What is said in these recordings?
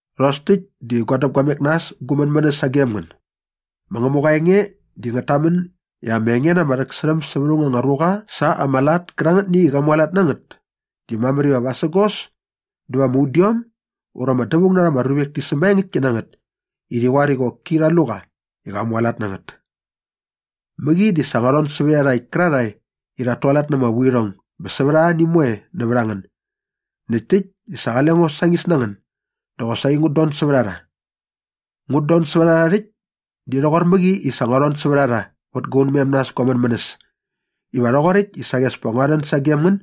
Rhos täkt diva gua däpguamek na äs gu mänmänäs sagem ngän. Ma Ngämuqa aa enge di ngät tamän i ama enge na ama rhäksärhäm sävät aung anga ruqa sa ama lat kärangätni i qa mualat na ngät di mamär iva vasägos dä va ama udiom ura ama dävaung na rha ama ruvek ti sämaengäktki na ngät i rhi qoar i qoki rha lu qa i qa mualat na ngät. Mäqi di sa ngua rhon sävät iarhakt kärarhae i rhat tualat na ama vuirhong bä sävät arhani moe nävät a ngän näkt täkt i sa qale ngo sañis na ngän dä qosaqi ngut don sävät a rha. Ngut don sävät a rha rhäkt di rhoqor mäqi i sa ngua rhon sävät a rha vät gua unmem na äs gu mänmänäs iva nga rhoqoräkt i saqi as pa ngua rhän sagem ngän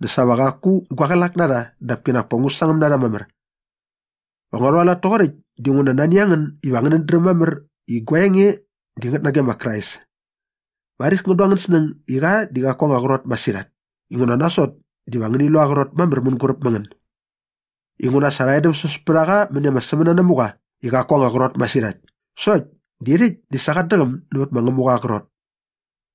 dä sa va qaku gua qlak na rha dap kinak pa ngu sangäm na rha mamär. Va ngua rhualat toqoräkt dinguna nani a ngän iva ngänät dräm mamär i gua enge di ngät nage ma Krais. Varis ngän du angän snäng i qa di qaku aa anga qrot masirhat inguna nasot diva ngäni lu aa qrot mamär mänguräp ma ngän. Inguna sa rha edämsäs pät a qa mäni ama sämänanamuqa i qaku aa anga qrot masirhat sokt di rhäkt di sa qat däqäm nävät ma Ngämuqa aa qrot.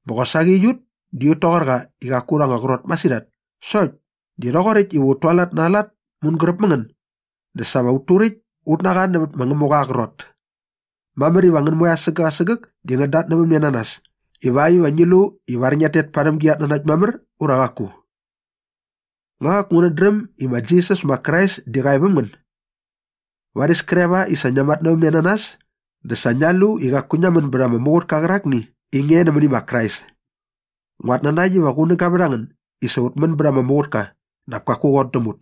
Bä qosaqi aiut di ut toqor qa i qaku urha anga qrot masirhat sokt di rhoqoräkt iva ut tualat na aa lat mänguräp mä ngän dä sa va ut turäkt ut na qa nävät ma Ngämuqa aa qrot. Mamär iva ngän moe asägäk asägäk di ngiat tatnävämne na nas ivakt iva ngi lu ivar ngiat tet parhäm gi gatnanakt mamär ura qaku. Nga qaku ngänät dräm i ma Jisas ma Krais di qa e väm ngän? Varis kre va i sa ngia matnävämne na nas dä sa ngia lu i qaku ngia män bät ama muqutka qärakni i nge nämäni ma Krais. Nguat nanakt iva qunäga vät a ngän i sa ut män bät ama muqutka dap kaku qot däm ut.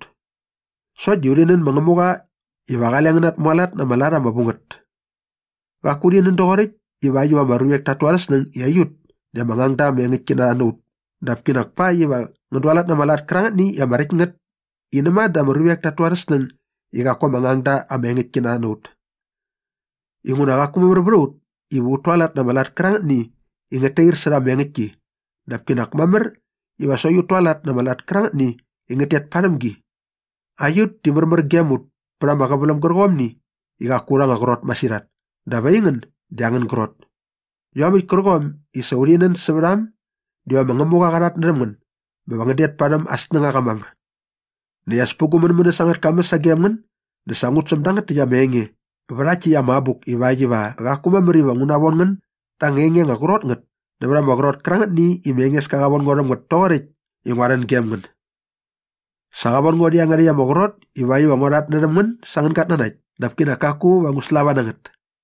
Sokt di urhi nän ma Ngämuqa iva qale ngän natmualat na ama lat ama vu ngät. Qaku urhi nän doqoräkt ivakt iva ama ruvek tat tu arhä snäng i aiut di ama ngangda ama engäktki na rha na ut dap kinak pakt iva ngän dualat na ama lat kärangätni i ama räkt ngät i näma dä ama ruvek tat tu arhä snäng i qaku ama ngangda ama engäktki na rha na ut. Inguna qaku mamär vät a ut iva ut tualat na ama lat kärangätni i ngät tair särha ama engäktki dap kinak mamär iva sokt ut tualat na ama lat kärangätni i ngät tet parhäm gi. Aiut di märmär gem ut pät ama qäväläm gärqomni i qaku aurha anga qrot masirhat dap aingän di angän grot. Iomäkt kärqom i sa urhi nän sävät a äm diva ma Ngämuqa qa rhatnärhäm ngän bä va ngän det parhäm aa snängaqa mamär. Näkt as pä gu mänmänäs angät kamäs sagem ngän dä sa ngut säm dangät täkt ama enge vä rhakt täkt ama abuk ivakt iva qaku mamär iva ngu navon ngän da anga enge anga qrot ngät nävät ama qrot kärangätni i ma Engeska qa von ngo rhäm ngät toqoräkt i ngua rhän gem ngän. Sa qa von ngo rhä iangärhäkt ama qrot ivakt iva ngua rhatnärhäm ngän sa angän gatnanakt dap kinak kaku va ngu slava na ngät.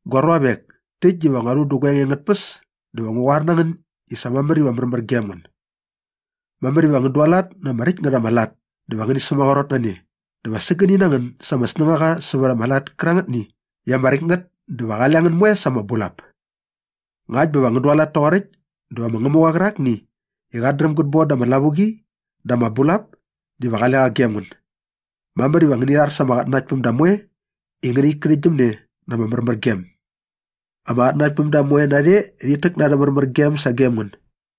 Gua ruavek, täkt diva ngua rhu dä gua enge angät tpäs dä va ngu qoar na ngän i sa mamär iva märmär gem ngän. Mamär iva ngän dualat na ama räkt ngät ama lat dä va ngäni sämaqrot na ne dä va sägäni na ngän sa ama snängaqa sävät ama lat kärangätni i ama räkt ngät dä va qale ngän moe sa ama bulap. Ngakt bä va ngän dualat toqoräkt dä va ma Ngämuqa qärakni i qat dräm gät bon da ama lavuqi dä ama bulap diva qale qa gem ngän. Mamär iva ngäni rhar sa ama qatnanaktpämda moe i ngänit kärhäktgyäm ne na ama märmärgem. Ama qatnanaktpämda moe narhe rhit täk na arhä märmärgem sagem ngän.